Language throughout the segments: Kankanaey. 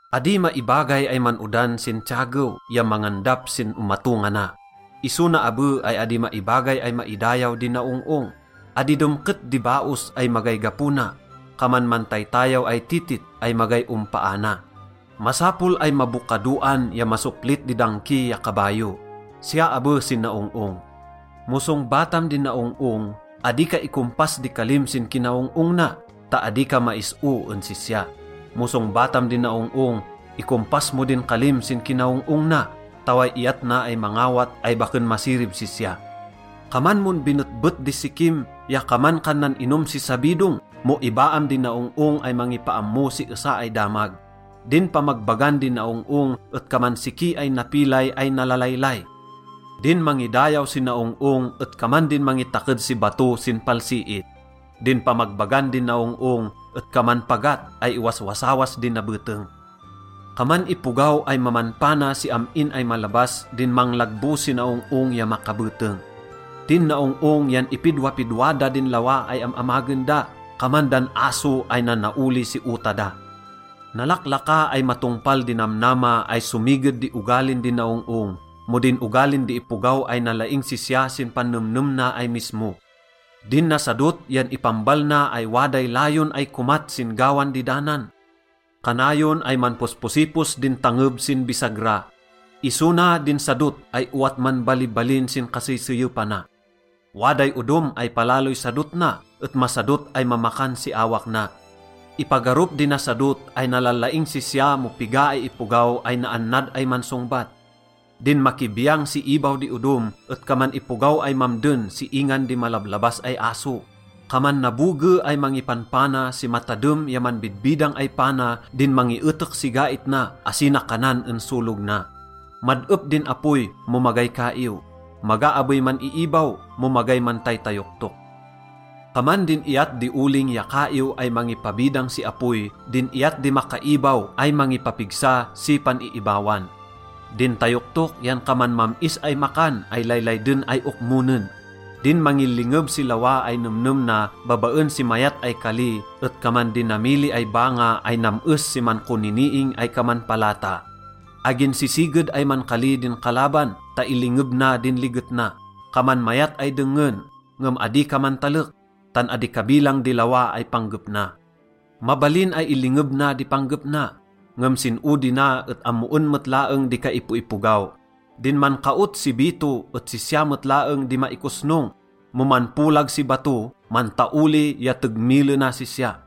Adi maibagay ay man-odan sin tiyagew ya mangandap sin omatongana. Iso na abe ay adi maibagay ay maidayaw di naong-ong. Adi demket di baos ay magay gapo na, kaman mantaytayaw ay titit ay magay ompaana. Masapol ay mabokadoan ya masoplit di dangki ya kabayo, siya abe sin naong-ong. Mo songbatam di naong-ong, adi ka ikompas di kalim sin kinaong-ong na ta adi ka mais-o en sisya. Mo songbatam di naong-ong, ikompas mo din kalim sin kinaong-ong na ta way iyat na ay mangawat ay baken masirib sisya. Kaman mon binetbet di sikim ya kaman kan nan-inom si sabidong mo ibaam di naong-ong ay mangipaammo si esa ay damag. Din pamagbagan di naong-ong et kaman siki ay napilay ay nalalaylay. Din mangidayaw si naong-ong et kaman din mangitaked si bato sin palsiit. Din pamagbagan di naong-ong et kaman pagat ay iwaswasawas di nabeteng. Kaman ipogaw ay mamanpana si am-in ay malabas din manglagbo si naong-ong ya makabeteng. Din naong-ong yan ipidwapidwa da din lawa ay am-amagen da, kaman dan aso ay nanaoli si ota da. Nalaklaka ay matongpal di namnama ay somiged di ogalin di naong-ong mo din ogalin di ipogaw ay nalaing sisya sin pannemnem na ay mismo. Din nasadot yan ipambal na ay waday layon ay komat sin gawan di danan. Kanayon ay manposposipos din tangeb sin bisagra, iso na din sadot ay owat manbalibalin sin kaseyseyepana. Waday odom ay palaloy sadot na et masadot ay mamakan si awak na. Ipagarup di nasadot ay nalalaing sisya mo piga ay ipogaw ay naannad ay mansongbat. Din makibiyang si ibaw di odom et kaman ipogaw ay mamden si ingan di malablabas ay aso. Kaman naboge ay mangipanpana si matadem ya manbidbidang ay pana din mangietek si gait na asi na kanan en solog na. Mad-ep din apoy mo magay kaiw, maga abey man-iibaw mo magay mantaytayoktok. Kaman din iyat di oling ya kaiw ay mangipabidang si apoy din iyat di makaibaw ay mangipapigsa si pan-iibawan. Din tayoktok yan kaman mam-is ay makan ay laylayden ay okmonen. Din mangilingeb si lawa ay nemnem na babaen si mayat ay kali et kaman dinamili ay banga ay nam-es si mankoniniing ay kaman palata. Agin sisiged ay mankali din kalaban ta ilingeb na din liget na. Kaman mayat ay dengngen, ngem adi ka mantalek, tan adi kabilang di lawa ay panggep na. Mabalin ay ilingeb na di panggep na, ngem sin odi na et ammoen met laeng di kaipoipogaw. Din mankaot si bito et sisya met laeng di maikosnong, mo manpolag si bato, mantaoli ya tegmilena sisya.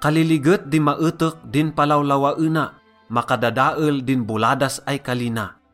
Kaliliget di maetek din palawlawaena. Makadadael din boladas ay kali na.